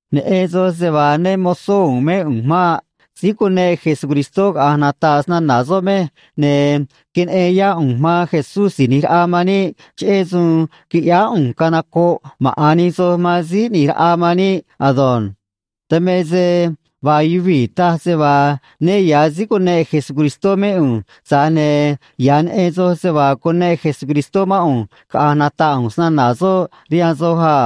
Neꞌen soj se vaa né mo̱zó u̱u̱n mé ꞌu̱nj maꞌ. Síí cuneꞌ Jesucristó caꞌa̱nj nata̱ꞌ snana̱ soꞌ mej, ne̱ queneꞌen yá ꞌu̱nj man Jesús Si̱j ꞌNi̱j Raꞌa man níꞌ, cheꞌé suun quiꞌyáá ꞌu̱nj canocoꞌ maꞌa̱n nij soj man Síí ꞌNi̱j Raꞌa man níꞌ ado̱nj. Dan me se vaa yuvii̱ taj se vaa né ya̱ síí cuneꞌ Jesucristó mé ꞌu̱nj, tza̱j ne̱ ya̱ neꞌen soj se vaa cuneꞌ Jesucristó mán ꞌu̱nj caꞌa̱nj nata̱ꞌ ꞌu̱nj snana̱ soꞌ rihaan soj a.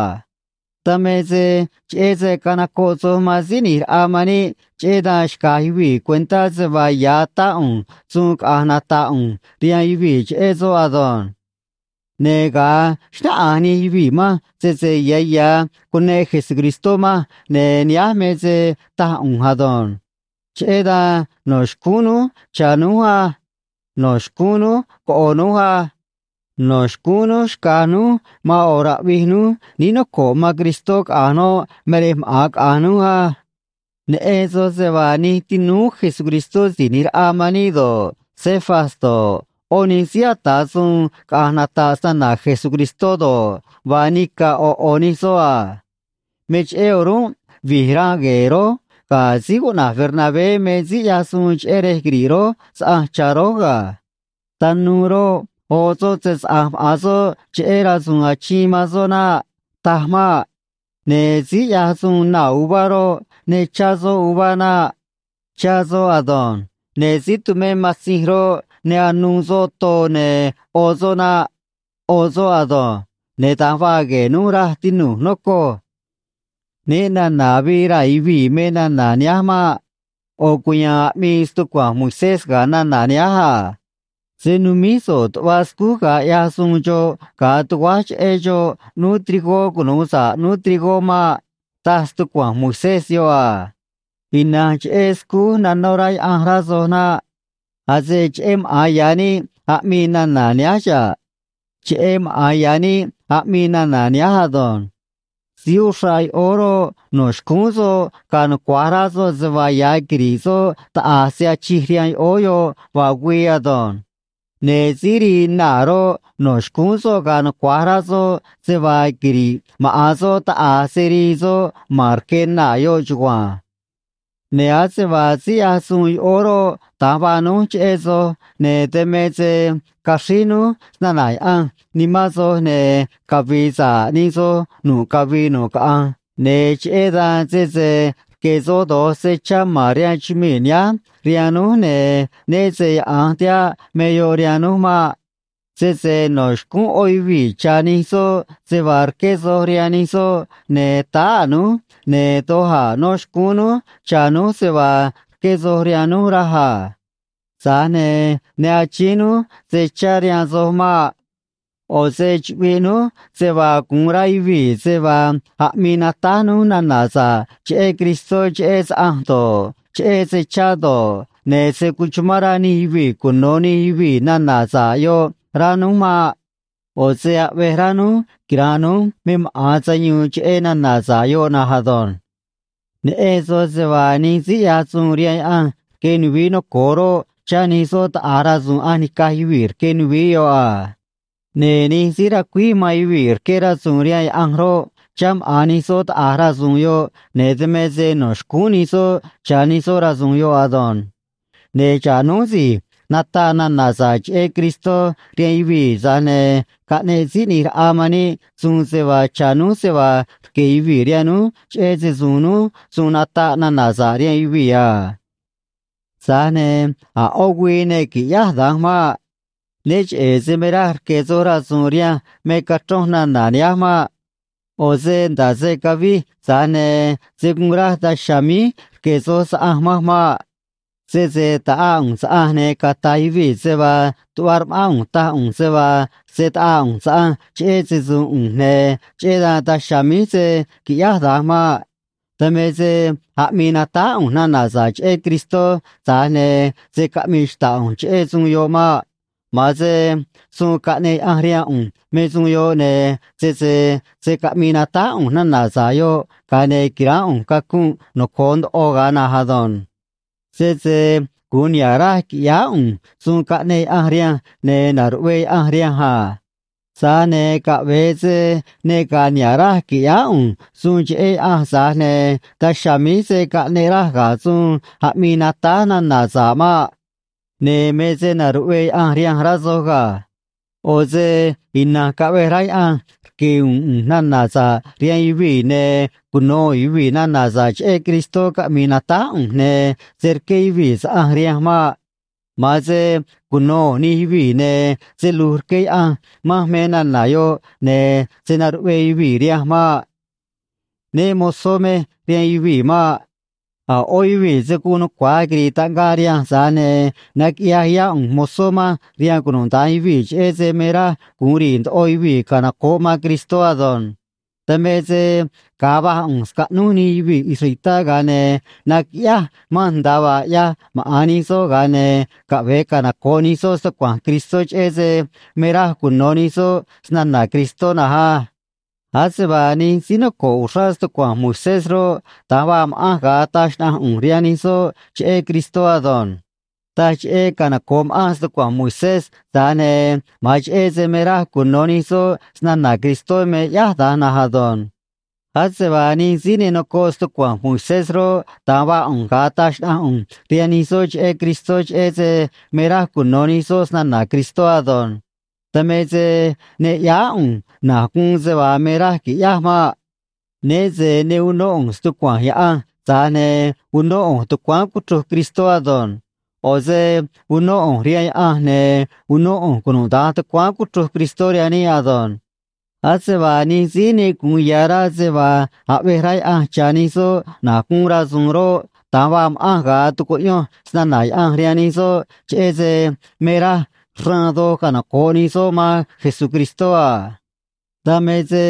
Dan me se cheꞌé se canocoꞌ soj man Síí ꞌNi̱j Raꞌa man níꞌ, cheꞌé dan xca̱j yuvii̱ cuentá se vaa ya̱ atá ꞌu̱nj suun caꞌa̱nj nata̱ꞌ ꞌu̱nj rihaan yuvii̱ cheꞌé soꞌ ado̱nj. Ne̱ ga̱a xnáꞌanj nij yuvii̱ manj sese ya̱ ya̱ cuneꞌ Jesucristó manj, ne̱ nihánj me se taj ꞌu̱nj ado̱nj: Cheꞌé dan no̱ xcúún núj cha̱ núj á. No̱ xcúún núj coꞌo̱ núj á. No̱ xcúún núj xca̱j núj man ꞌo̱ raꞌvij núj níí noco̱ꞌ man Cristó, caꞌa̱nj noꞌ me rej maꞌa̱n caꞌa̱nj núj á. Neꞌen soj se vaa nij tinúú Jesucristó Si̱j ꞌNi̱j Raꞌa man níꞌ do̱ꞌ, Cefas do̱ꞌ, ꞌó nij síí ata̱ suun caꞌa̱nj nata̱ꞌ snana̱ Jesucristó do̱ꞌ, vaa nica̱ ꞌo̱ ꞌo̱ nij soꞌ a. Me cheꞌé o̱rúnꞌ vi̱j ranꞌ gue̱e̱ rój ga̱ síí cuꞌna̱j Bernabé me síí ꞌyaj suun cheꞌé rej quiri̱ꞌ rój saꞌanj cha̱ rój ga̱. Tanuu roꞌ, oꞌ soꞌ se‑saꞌa̱nj maꞌa̱n soꞌ cheꞌé rasu̱u̱n achiin man soꞌ naꞌ. Taj maꞌ. Ne̱ síí ꞌyaj suun naa̱ uvá roꞌ, ne chá soꞌ uvá naꞌ. Chá soꞌ ado̱nj. Ne̱ síí tumé matzinj roꞌ, ne anuu soꞌ too ne̱ ꞌo soꞌ naꞌ. ꞌO soꞌ ado̱nj. Ne̱ da̱nj vaa gue̱e̱ núj, raj, tinu̱j, nocoj. Né na̱na̱ avii raa̱ yuvii̱ me nana̱ nihánj maꞌ. ꞌO̱ cuya̱a̱n aꞌmii stucua̱nj Moisés ga̱ nana̱ nihánj a: “Se̱ numíj so̱ꞌ tuꞌva scúj ga̱a ꞌyaj suun xoꞌ ga̱a tuguáj cheꞌé xoꞌ ꞌnúú trigó cunu̱u sa̱ꞌ ꞌnúú trigó maꞌ”, taj stucua̱nj Moisés yoꞌ a. Ina̱nj cheꞌé scúj nanó rá Yaꞌanj, rá soj naꞌ. Ase cheꞌé maꞌa̱n ya̱ níꞌ aꞌmii nana̱ nihánj xa̱ꞌ. Cheꞌé maꞌa̱n ya̱ níꞌ aꞌmii nana̱ nihánj ado̱nj. Síí uxraꞌ yoꞌóó roꞌ, no̱ xcúún soꞌ ga̱a̱ nucua̱j rá soꞌ se vaa ya̱ quiri̱ꞌ soꞌ taꞌa̱j se achij rihaan yoꞌóó yoꞌ vaa güii ado̱nj. Ne̱ síí rii naa̱ roꞌ, no̱ xcúún soꞌ ga̱a̱ nucua̱j rá soꞌ se vaa quiri̱ꞌ maꞌa̱n soꞌ taꞌa̱j se rii soꞌ man rque naa̱ yoꞌ chugua̱nj. Ne̱ ase vaa síí ꞌyaj suun yoꞌóó roꞌ, da̱nj vaa núj cheꞌé soj, ne̱ dan me se caxríj núj snana̱ Yaꞌanj nimán soj, ne̱ cavi̱i̱ sa̱ꞌ nij soj nu̱ꞌ cavii nu̱ꞌ caꞌanj, ne̱ cheꞌé dan, sese rque̱ soj do̱j se chá ma̱n rihaan chumii̱ nihánj rihaan núj, ne̱ né se yaꞌa̱nj tihaꞌ me yoꞌ rihaan núj maꞌ. Sese no̱ xcúún ꞌó yuvii̱ cha̱ nij soꞌ se vaa rqué soj rihaan nij soꞌ, ne̱ táá a̱ núj, ne̱ doj a̱ no̱ xcúún núj cha̱ núj se vaa rqué soj rihaan núj, raj a. Tza̱j ne̱ ne achíín núj se chá rihaan soj maꞌ. ꞌO̱ se chuꞌviꞌ núj se vaa gu̱un rá yuvii̱ se vaa aꞌmii natáj núj nana̱ sa̱ꞌ cheꞌé Cristó cheꞌé saꞌanj do̱ꞌ, cheꞌé se chá do̱ꞌ, ne̱ se̱ cuchumán rá nij yuvii̱ cuno̱ nij yuvii̱ nana̱ sa̱ꞌ yoꞌ, rá núj maꞌ. ꞌO̱ se aꞌvej rá núj quira̱nꞌ núj me maꞌa̱n sayuun cheꞌé nana̱ sa̱ꞌ yoꞌ na̱nj ado̱nj. Neꞌen soj se vaa nij síí ꞌyaj suun rihaan Yaꞌanj rque nuvií noco̱o roꞌ, chá nij soꞌ taꞌa̱j rasu̱u̱n ꞌanj nica̱j yuvii̱ rque nuvií yoꞌ a. Ne̱ nij síí racuíj man yuvii̱ rqué rasu̱u̱n rihaan Yaꞌanj roꞌ, chá maꞌa̱n nij soꞌ taꞌa̱j rasu̱u̱n yoꞌ, ne̱ dan me se no̱ xcúún nij soꞌ cha̱ nij soꞌ rasu̱u̱n yoꞌ ado̱nj. Ne̱ xa̱ꞌ núj si̱j nataꞌ nana̱ sa̱ꞌ cheꞌé Cristó rihaan yuvii̱, tza̱j ne̱ caꞌneꞌ Síí ꞌNi̱j Raꞌa man níꞌ suun se vaa cha̱ núj se vaa rque̱ yuvii̱ rihaan núj cheꞌé se‑su̱u̱n núj suun nataꞌ nana̱ sa̱ꞌ rihaan yuvii̱ a. Tza̱j ne̱ a̱ ꞌó güii ne qui̱ꞌyáj da̱nj maꞌ. Né cheꞌe̱ se me raj rque̱ soj rasu̱u̱n rihanj me cachronj nana̱ nihánj maꞌ. ꞌO̱ se nda̱ꞌ se cavij, tza̱j ne̱ se̱ guun raj daj chiha̱a̱ míj rque̱ soj saꞌanj manj maꞌ. Sese ta̱ꞌaa ꞌu̱nj saꞌanj, ne̱ cata̱j yuvii̱ se vaa tuꞌva rma̱ꞌán ꞌu̱nj taj ꞌu̱nj se vaa se̱ taꞌaa ꞌu̱nj saꞌanj cheꞌé se‑su̱u̱n ꞌu̱nj, ne̱ cheꞌé dan daj chiha̱a̱ míj se̱ quiꞌyáj da̱nj maꞌ. Dan me se aꞌmii natáj ꞌu̱nj nana̱ sa̱ꞌ cheꞌé Cristó, tza̱j ne̱ se̱ caꞌmii xta̱ꞌ ꞌu̱nj cheꞌé suun yoꞌ maꞌ. Ma̱an se suun caꞌneꞌ Yaꞌanj rihaan ꞌu̱nj me suun yoꞌ, ne̱ sese se̱ caꞌmii natáj ꞌu̱nj nana̱ sa̱ꞌ yoꞌ, ga̱a ne̱ qui̱ránꞌ ꞌu̱nj cacunꞌ noco̱o ndoꞌo ga̱a na̱nj ado̱nj. Sese gu̱un niha̱ꞌ raj qui̱ꞌyáá ꞌu̱nj suun caꞌneꞌ Yaꞌanj rihanj, ne̱ na̱ruꞌvee Yaꞌanj rihanj a. Tza̱j ne̱ caꞌve̱e se ne ga̱a̱ niha̱ꞌ raj qui̱ꞌyáá ꞌu̱nj suun cheꞌé Yaꞌanj, tza̱j ne̱ daj chiha̱a̱ míj se̱ caꞌneꞌ raj ga̱ suun aꞌmii natáj nana̱ sa̱ꞌ maꞌ. Ne̱ me se na̱ruꞌvee Yaꞌanj rihanj, rá soj ga̱. ꞌO̱ se ina̱nj caꞌve̱j rá Yaꞌanj rque̱ u̱u̱n ꞌu̱nj nana̱ sa̱ꞌ rihaan yuvii̱, ne̱ cuno̱ u̱u̱n yuvii̱ nana̱ sa̱ꞌ cheꞌé Cristó caꞌmi̱i̱ natáj ꞌu̱nj, ne̱ se̱ rqué yuvii̱ saꞌanj rihanj maꞌ. Ma̱an se cuno̱ u̱u̱n nij yuvii̱, ne̱ se lu̱j rqué Yaꞌanj manj me nana̱ yoꞌ, ne̱ se̱ naruꞌvee yuvii̱ rihanj maꞌ. Né mo̱zó mej rihaan yuvii̱ maꞌ. A̱ ꞌó yuvii̱ se̱ guun nucua̱j quiri̱i̱ taꞌngaꞌ rihanj, tza̱j ne̱ naquiꞌyaj yá ꞌu̱nj mozó manj rihaan cunuda̱nj yuvii̱, cheꞌé se me raj gu̱un ri̱i̱ ndoꞌo yuvii̱ canoco̱ꞌ man Cristó ado̱nj. Dan me se ga̱a va̱j ꞌu̱nj scaꞌnúj nij yuvii̱ israelitá, ga̱a ne̱ naquiꞌyáj manj nda̱a vaa ꞌyaj maꞌa̱n nij soꞌ, ga̱a ne̱ caꞌve̱e canoco̱ꞌ nij soꞌ stucua̱nj Cristó, cheꞌé se me raj cuno̱ nij soꞌ snana̱ Cristó na̱nj á. Ase vaa nij síí noco̱ꞌ uxrá stucua̱nj Moisés roꞌ, da̱nj vaa ma̱ꞌanj ga̱a taj xnaꞌanj ꞌu̱nj rihaan nij soꞌ cheꞌé Cristó ado̱nj. Taj cheꞌé canoco̱ꞌ ma̱ꞌanj stucua̱nj Moisés, tza̱j ne̱ ma̱an cheꞌé se me raj cuno̱ nij soꞌ snana̱ Cristó me ꞌyáj da̱nj na̱nj ado̱nj. Ase vaa nij síí ne nocoꞌ stucua̱nj Moisés roꞌ, da̱nj vaa ꞌu̱nj ga̱a taj xnaꞌanj ꞌu̱nj rihaan nij soꞌ cheꞌé Cristó, cheꞌé se me raj cuno̱ nij soꞌ snana̱ Cristó ado̱nj. Dan me se ne ꞌyáá ꞌu̱nj na̱j guun se vaa me raj qui̱ꞌyáj maꞌ. Né se ne unó ꞌu̱nj stucua̱nj Yaꞌanj, tza̱j ne̱ unó ꞌu̱nj tucuáán cuchruj Cristó ado̱nj. ꞌO̱ se unó ꞌu̱nj rihaan Yaꞌanj, ne̱ unó ꞌu̱nj cunuda̱nj tucuáán cuchruj Cristó rihaan níꞌ ado̱nj. Ase vaa nij síí ne gu̱un ya̱ rá se vaa aꞌvej rá Yaꞌanj cha̱ nij soꞌ na̱j guun rasu̱u̱n roꞌ, da̱nj vaa ma̱ꞌanj ga̱a tucuꞌyonj snana̱ Yaꞌanj rihaan nij soꞌ, cheꞌé se me raj xraan doj canoco̱ꞌ nij soꞌ man Jesucristó a. Dan me se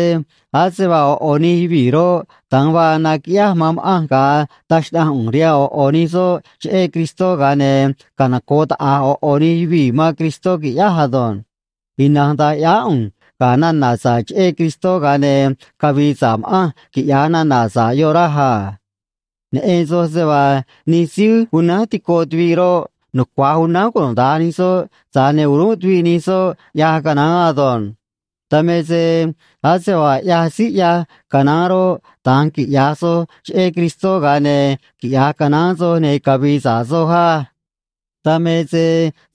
ase vaa ꞌo̱ ꞌo̱ nij yuvii̱ roꞌ, da̱nj vaa naquiꞌyáj man ma̱ꞌanj ga̱a taj xnaꞌanj ꞌu̱nj rihaan ꞌo̱ ꞌo̱ nij soꞌ cheꞌé Cristó, ga̱a ne̱ canoco̱ꞌ taꞌa̱j ꞌo̱ ꞌo̱ nij yuvii̱ man Cristó, qui̱ꞌyáj ado̱nj. Ina̱nj da̱nj ꞌyáá ꞌu̱nj ga̱ nana̱ sa̱ꞌ cheꞌé Cristó, ga̱a ne̱ cavi̱i̱ sa̱ꞌ ma̱ꞌanj, quiꞌya̱j nana̱ sa̱ꞌ yoꞌ, raj a. Neꞌen soj se vaa nij síí unánj tico tuviꞌ roꞌ, nucua̱j unánj cunuda̱nj nij soꞌ, tza̱j ne̱ o̱rúnꞌ tuviꞌ nij soꞌ ꞌyaj canaán ado̱nj. Dan me se ase vaa ꞌyaj síí ꞌyaj canaán roꞌ, da̱nj quiꞌya̱j soj cheꞌé Cristó, ga̱a ne̱ quiꞌya̱j canaán soj, ne̱ cavi̱i̱ sa̱ꞌ soj á. Dan me se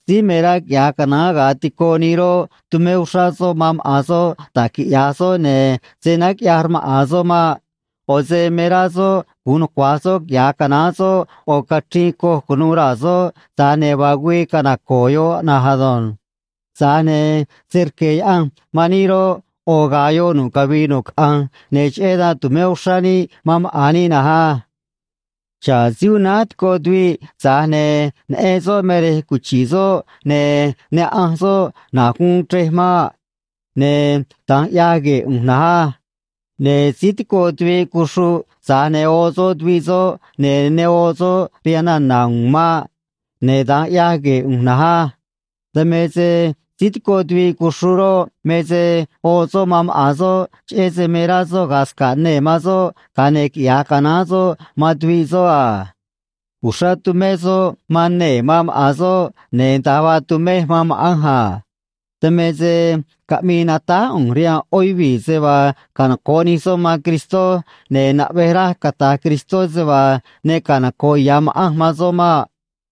síí me rá quiꞌya̱j canaán ga̱a tico nii roꞌ, tumé uxrá soꞌ man maꞌa̱n soꞌ da̱j quiꞌya̱j soꞌ, ne̱ se̱ náj quiꞌya̱j rmaꞌa̱n soꞌ maꞌ. ꞌO̱ se me rá soꞌ gu̱un nucua̱j soꞌ quiꞌya̱j canaán soꞌ ꞌo̱ cachriin coj cu̱nuû raa̱ soꞌ, tza̱j ne̱ vaa güii canaco̱o̱ yoꞌ na̱nj ado̱nj. Tza̱j ne̱ se rque̱ Yaꞌanj man níꞌ roꞌ, ꞌo̱ ga̱a̱ yoꞌ nu̱ꞌ cavii nu̱ꞌ caꞌanj, ne̱ cheꞌé dan tu̱mé uxrá níꞌ man maꞌa̱n níꞌ na̱nj á. Xa̱ꞌ síí unánj tico tuviꞌ, tza̱j ne̱ neꞌen soꞌ me rej cuchi̱ꞌ soꞌ, ne̱ ne ꞌanj soꞌ na̱j guun chrej maꞌ. Ne̱ da̱nj ꞌyaj gue̱e̱ ꞌu̱nj na̱nj á. Ne̱ síí tico tuviꞌ cuxruꞌ, tza̱j ne̱ oꞌ soꞌ tuviꞌ soꞌ, ne̱ ne oꞌ soꞌ rihaan nana̱ u̱u̱n maꞌ. Ne̱ da̱nj ꞌyaj gue̱e̱ ꞌu̱nj na̱nj á. Dan me se síí tico tuviꞌ cuxruꞌ roꞌ, me se oꞌ soꞌ man maꞌa̱n soꞌ, cheꞌé se me rá soꞌ ga̱a̱ sca̱ꞌ nee̱ man soꞌ, ga̱a ne̱ quiꞌya̱j canaán soꞌ man tuviꞌ soꞌ a. Uxrá tumé soꞌ man nee̱ man maꞌa̱n soꞌ, ne̱ da̱nj vaa tumej man ma̱ꞌanj a. Dan me se caꞌmii natáj ꞌu̱nj rihaan ꞌó yuvii̱ se vaa canoco̱ꞌ nij soꞌ man Cristó, ne̱ naꞌvej raj cata̱j Cristó se vaa ne canoco̱ꞌ ya̱ ma̱ꞌanj man soꞌ maꞌ.